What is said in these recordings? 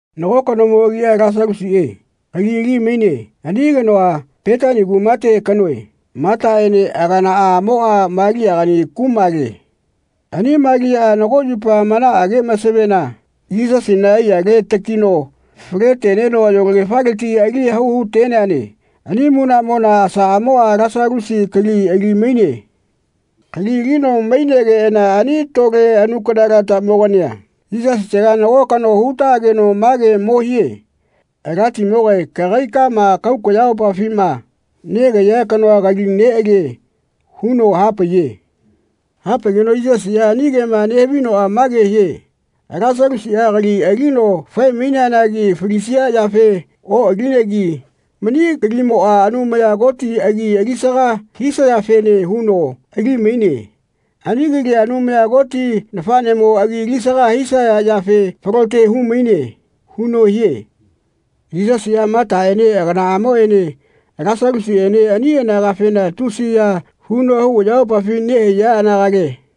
Nago kanomo agia Lasalusiꞌe kali ali-maine. Ani kanoa Petani kumate kanoe. Mataꞌene aganaꞌamoꞌa Maliagani kumale. Ani Maliaꞌa nago yupa manaꞌage masavena Yisasina aiyale takino fale-teneno ayolagefaleti ali hau hu-teneane. Ani munaꞌmona asaꞌamoꞌa Lasalusi kali ali-maine. Kali alino mainegeꞌana ani tole nanukana-latamogania Yisasitega nago kano hu-taꞌageno mage mo hie “Alatimogae kagaikama kahau kayamopafima negahaiya kanoa kali neꞌalie.” huno hapaiye. Hapaigeno Yisasiꞌa ani kema nehavinoꞌa mage hie “Lasalusiꞌa kali alino fae-maineanagi falisia yafe oꞌalinegi mani kalimoꞌa Anumaya Koti agi alisaga hisayafene huno ali-maine. Ani kalia Anumaya Koti nafaꞌnemo agi alisaga hisaya yafe falote hu-maine.” huno hie. Yisasiꞌa Mataꞌene aganaꞌamoꞌene Lasalusiꞌene ani anagafena tusiya huno hau ayamopafi nehaiya anagale.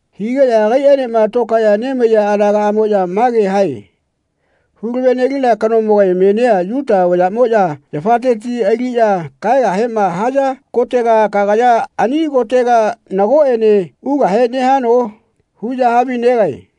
Higeꞌya agaiꞌaenema tokaeꞌya nemaiya anagaꞌmoꞌya mage hae “Hu-lave-nelina kanomoga menia Yuta vayaꞌmoꞌya yafateti aliꞌya kahaegahema haya kotega kagaya ani kotega nagoꞌene ugahe nehano?” huꞌya havinegae.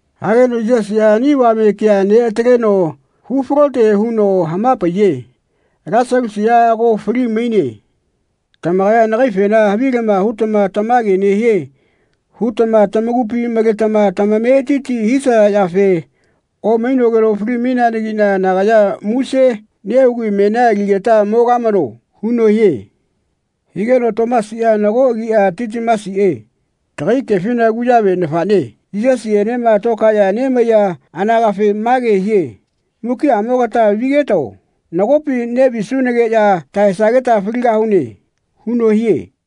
Hageno Yisasiꞌa ani avame kea neꞌataleno hu-falote huno hama-paiye “Lasalusiꞌa ago fali-maine. Tamakaya nagaifena havilama hutama ‘Tamage nehie.’ hutama tamakupi maletama tamametiti hisaya yafe omainogeno fali-maineanagiꞌna nagaya muse nehugi menia aligeta mogamano.” huno hie. Higeno Tomasina, nago agia Titimasiꞌe, tagai kefina kuyave nafaꞌne, Yisasienema tokaeꞌya nemaiya anagafe mage hie “Mukiꞌamogata vigetao. Nagopi neꞌvisunageꞌya tahaesageta faligahune.” huno hie.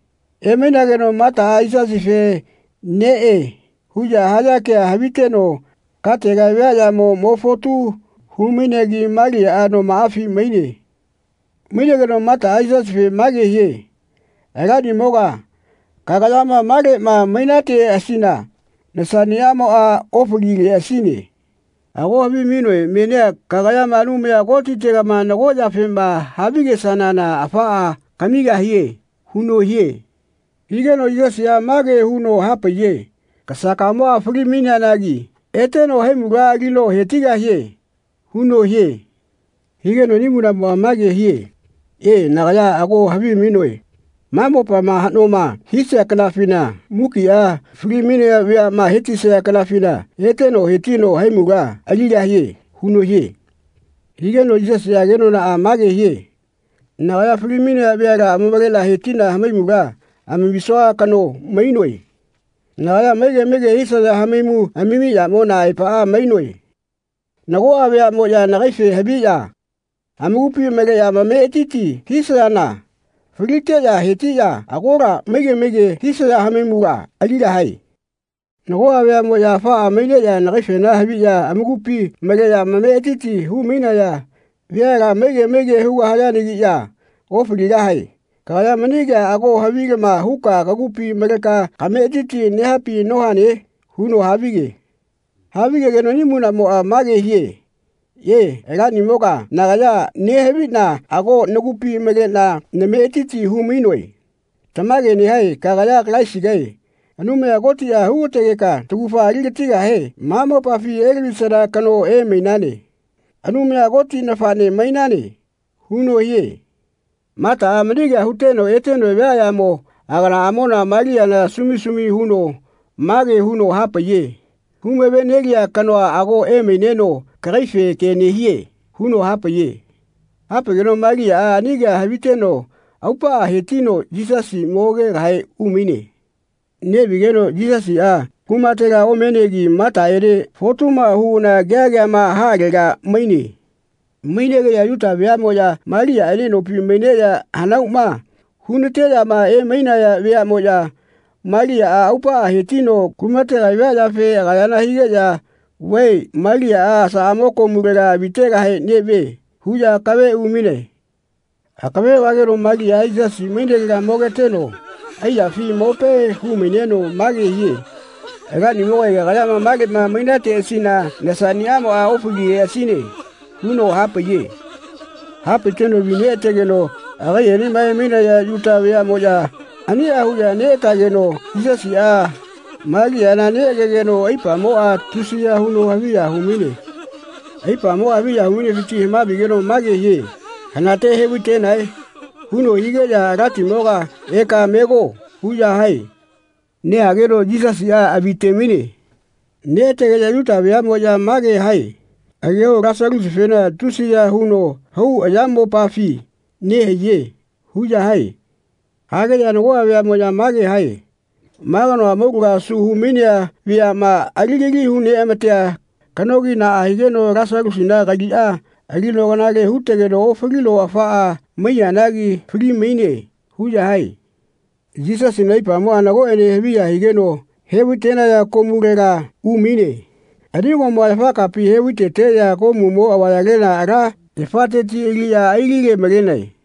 Emainageno Mataꞌa Yisasife “Neꞌe.” huꞌya haya kea haviteno katega viaꞌyamo mo fotu hu-mainegi Maliaꞌa nomaꞌafi maine. Mainegeno Mataꞌa Yisasife mage hie “Alanimoga kagayama maleꞌma mainateꞌasina nasaꞌnimoꞌa ofalileꞌasine. Ago havimainoe menia kagayama Anumaya Kotitega nago yafema havigesanana afaꞌa kamigahie.” huno hie. Higeno Yisasiꞌa mage huno hapaiye “Kasakamoꞌa fali-maineanagi eteno haimula alino he-tigahie.” huno hie. Higeno ani munaꞌmoꞌa mage hie “E, nagaya ago havimainoe ma mopama haꞌnoma hisia kanafina mukiꞌa fali-mainaya veaꞌma he-tisaya kanafina eteno he-tino haimula aligahie.” huno hie. Higeno Yisasiꞌa kenonaꞌa mage hie “Nagaya fali-mainaya veala amavale he-tiꞌna hamaimula amamisua kano mainoe. Nagaya maige maige hisaya hamaimu amami yamona aepaꞌa mainoe. Nagoꞌa veaꞌmoꞌya nagaife haviꞌya amakupi maleꞌya amametiti hisayana faliteꞌya hetiꞌya agola maige maige hisaya hamaimula aligahae. Nagoꞌa veaꞌmoꞌya afaꞌa maineꞌya nagaifena haviꞌya amakupi maleꞌya amametiti hu-mainaya veala maige maige hugahayanagiꞌya ofaligahae. Kagaya mani kea ago havilama huka kagupi maleka kametiti nehapi nohane?” huno havige. Havigegeno ani munaꞌmoꞌa mage hie “E, Alanimoga nagaya nehaviꞌna ago nagupi maleꞌna nametiti hu-mainoe. Tamage nehae kagaya Kalaisigae Anumaya Kotiꞌa hu-ga-tegeka taugafa ali-gatigahe ma mopafi elavisana kano emainane. Anumaya Koti nafaꞌne mainane.” huno hie. Mataꞌa mani kea huteno eteno viaꞌyamo aganaꞌamona Maliana sumi sumi huno mage huno hapaiye “Hu-mave-nelia kanoa ago emaineno kagaife ke nehie.” huno hapaiye. Hapaigeno Maliaꞌa ani kea haviteno aupaꞌa he-tino Yisasi mogegahe umaine. Neꞌvigeno Yisasiꞌa kumatela omenegi Mataꞌene fotuma huꞌana kea keama haꞌalega maine. Mainegeꞌya Yuta veaꞌmoꞌya Maliaꞌene nopi maineꞌya hanauma hu-nateꞌyama emainaya veaꞌmoꞌya Maliaꞌa aupaꞌa he-tino kumatega via yafe agayana higeꞌya “Vae Maliaꞌa asaꞌamo komulega avitegahe neꞌvie.” huꞌya akave umainae. Akave vageno Maliaꞌa Yisasi mainelega mogeteno aiyafi mope hu-maineno mage hie “Alanimogae kagayama maleꞌma mainateꞌasina nasaꞌnimoꞌa ofalileꞌasine.” huno hapaiye. Hapaiteno avi neꞌategeno agaiꞌenema emainaya Yuta veaꞌmoꞌya aniꞌa huꞌya neꞌatageno Yisasiꞌa Maliana neꞌagegeno aipamoꞌa tusiya huno haviya hu-maine. Aipamoꞌa haviya hu-mainefiti hama-vigeno mage hie “Hanate he-vai-tenae?” huno higeꞌya “Alatimoga eka mego.” huꞌya hae. Nehageno Yisasiꞌa avi-te-maine. Neꞌategeꞌya Yuta veaꞌmoꞌya mage hae “Ageho Lasalusifena tusiya huno hau ayamopafi nehaiye.” huꞌya hae. Hageꞌya nagoꞌa veaꞌmoꞌya mage hae “Ma kanoa amaulagama asu hu-mainea veaꞌma aligali hu-neꞌamatea kanogi naꞌa higeno Lasalusina kaliꞌa alino kanale hu-tegeno ofalino afaꞌa maiyanagi fali-maine.” huꞌya hae. Yisasina aipamoꞌa nagoꞌene haviya higeno he-vai-tenaya komulega umaine. Ani komua yafa kapi he-vai-teteꞌya komumo avayalela ala yafateti aliꞌya ai-lile-malenae.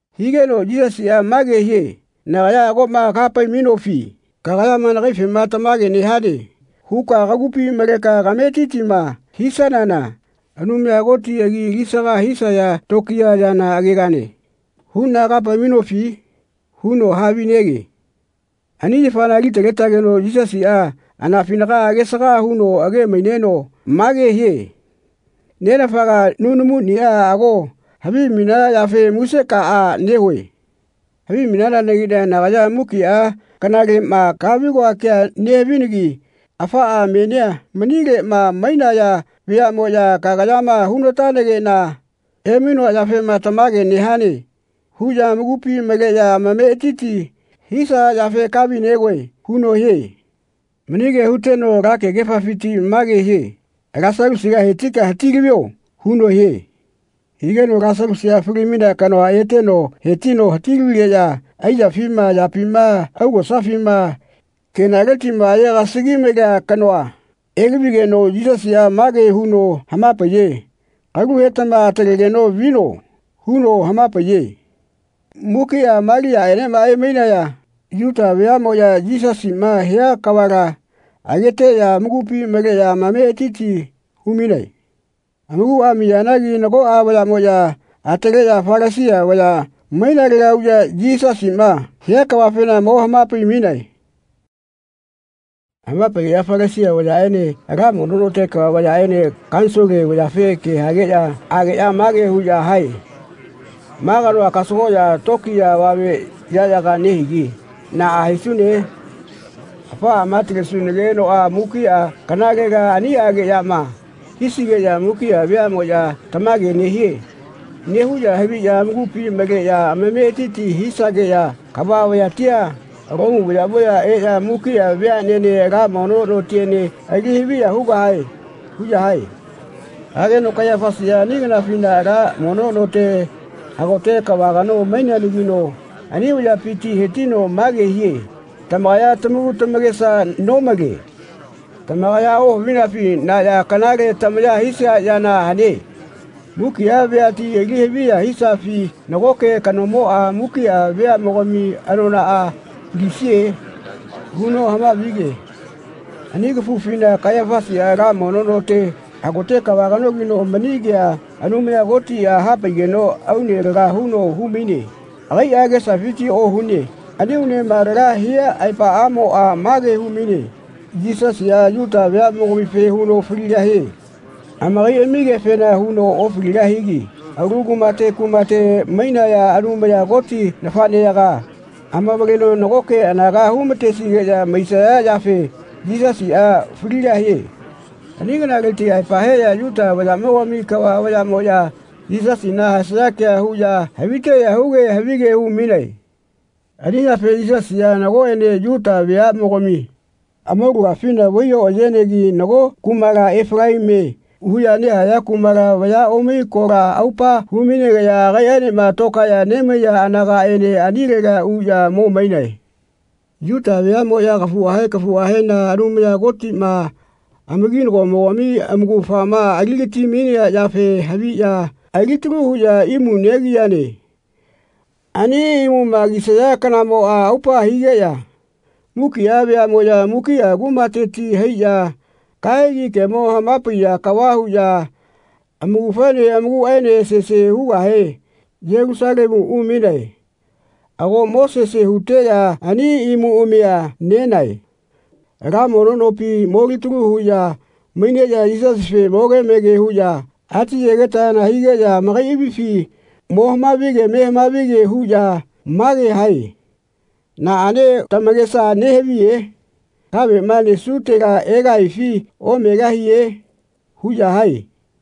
Higeno Yisasiꞌa mage hie “Nagaya ago kaha-pai-mainofi? ‘Kagayama nagaifema tamage nehane huka kagupi maleka kametitima hisanana Anumaya Koti agi alisaga hisaya tokiya yana agegane huꞌna kaha-pai-mainofi?’ huno havinege.” Ani yafana ali-taletageno Yisasiꞌa anafinaga agesaga huno age-maineno mage hie “Nenafaga nunamuniꞌa ago havimainana yafe musekaꞌa nehue. Havimainanagiꞌna nagaya mukiꞌa kanalema kahavi-goa kea nehavinagi afaꞌa menia manileꞌma mainaya veaꞌmoꞌya kagayama hu-na-tanageꞌna emainoa yafema ‘Tamage nehane.’ huꞌya amakupi maleꞌya ametiti hisaya yafe kahavi-negoe.” huno hie. Mani kea huteno ala kegefafiti mage hie “Lasalusiga he-tika elavio.” huno hie. Higeno Lasalusiꞌa, fali-mainea kanoa, eteno he-tino elavigeꞌya aiyafima ayapima augosafima kenaletiꞌma aye-gasagi-malea kanoa elavigeno Yisasiꞌa mage huno hama-paiye “Kalu hetama atalegeno vino.” huno hama-paiye. Mukiꞌa Maliaꞌenema emainaya Yuta veaꞌmoꞌya Yisasiꞌma hia kavala ageteꞌya amakupi maleꞌya amametiti hu-mainae. Amakuꞌa amiyanagi nagoꞌa vayaꞌmoꞌya ataleꞌya Falasia vaya mainalega uꞌya Yisasiꞌma hia kavafena mo hama-pai-mainae. Hama-paigeꞌya Falasia vayaꞌene ala mono note kava vayaꞌene Kanisole vayafe ke hageꞌya ageꞌya mage huꞌya hae “Ma kanoa kasagoꞌya tokiya avame yaꞌyaga nehigi naꞌa hisune? Afaꞌama atalesunagenoꞌa mukiꞌa kanalela aniꞌageꞌyama hisigeꞌya mukiꞌa veaꞌmoꞌya ‘Tamage nehie.’ nehuꞌya haviꞌya amakupi maleꞌya amametiti hisageꞌya kava vayatia, Lomu vayaꞌmoꞌya eꞌya mukiꞌa veaꞌnene ala mono notiene ali haviya hugahae.” huꞌya hae. Hageno Kaiyafasiꞌa ani kafufina ala mono note hagote kava kano maineanagino ani vayapiti he-tino mage hie “Tamakaya tamaku tamakesa nomale. Tamakaya ohavinafi na ya kanale tamaya hisia yana hane? Mukiꞌa veati ali haviya hisafi nagoꞌke kanomoꞌa mukiꞌa veaꞌamogami anonaꞌa falisie?” huno hama-vige. Ani kafufina Kaiyafasiꞌa ala mono note hagote kava kanogino mani kea Anumaya Kotiꞌa hapaigeno aune laga huno hu-maine. Agaiꞌa agesafiti ohune. Ani aunema laga hia aepaꞌamoꞌa mage hu-maine “Yisasiꞌa Yuta veaꞌmogamife huno faligahie. Amakaiꞌamigetefena huno ofaligahigi alu kumate kumate mainaya Anumaya Koti nafaꞌneyaga amavaleno nagoke anaga hu-ma-tesigeꞌya maisaya yafe Yisasiꞌa faligahie.” Ani kanaleti aepa heꞌya Yuta vayaꞌmogami kava vayaꞌmoꞌya Yisasina haesaya kea huꞌya haviteꞌya huge havige hu-mainae. Ani yafe Yisasiꞌa nagoꞌene Yuta veaꞌmogami amaulagafina vai oꞌayenegi nago kumala Efalaimie huꞌya nehaya kumala vaya omai kola aupa hu-mainegeꞌya agaiꞌaenema tokaeꞌya nemaiya anagaꞌene anilega uꞌya mo mainae. Yuta veaꞌmoꞌya kafuꞌahe kafuꞌahena Anumaya Kotiꞌma amakinagomogami amaugafama ali-gati-mainea yafe haviꞌya alitalu huꞌya imu negiyane. Ani imuma kisaya kanamoꞌa aupa higeꞌya mukiꞌa veaꞌmoꞌya mukiꞌa kumateti haiꞌya kahegi kemo hama-paiya kava huꞌya amaugafaene amakuꞌaene sese hugahe Yelusalemu umainae. Ago mo sese huteꞌya ani imuꞌamia nenae. Ala mono nopi molitalu huꞌya maineꞌya Yisasife moge mege huꞌya ati-yegetayana higeꞌya amakaiꞌamifi mo hama-vige me hamavige huꞌya mage hae “Naꞌane tamakesa nehaviye? Kaveꞌma nesutela egahifi omegahie?” huꞌya hae.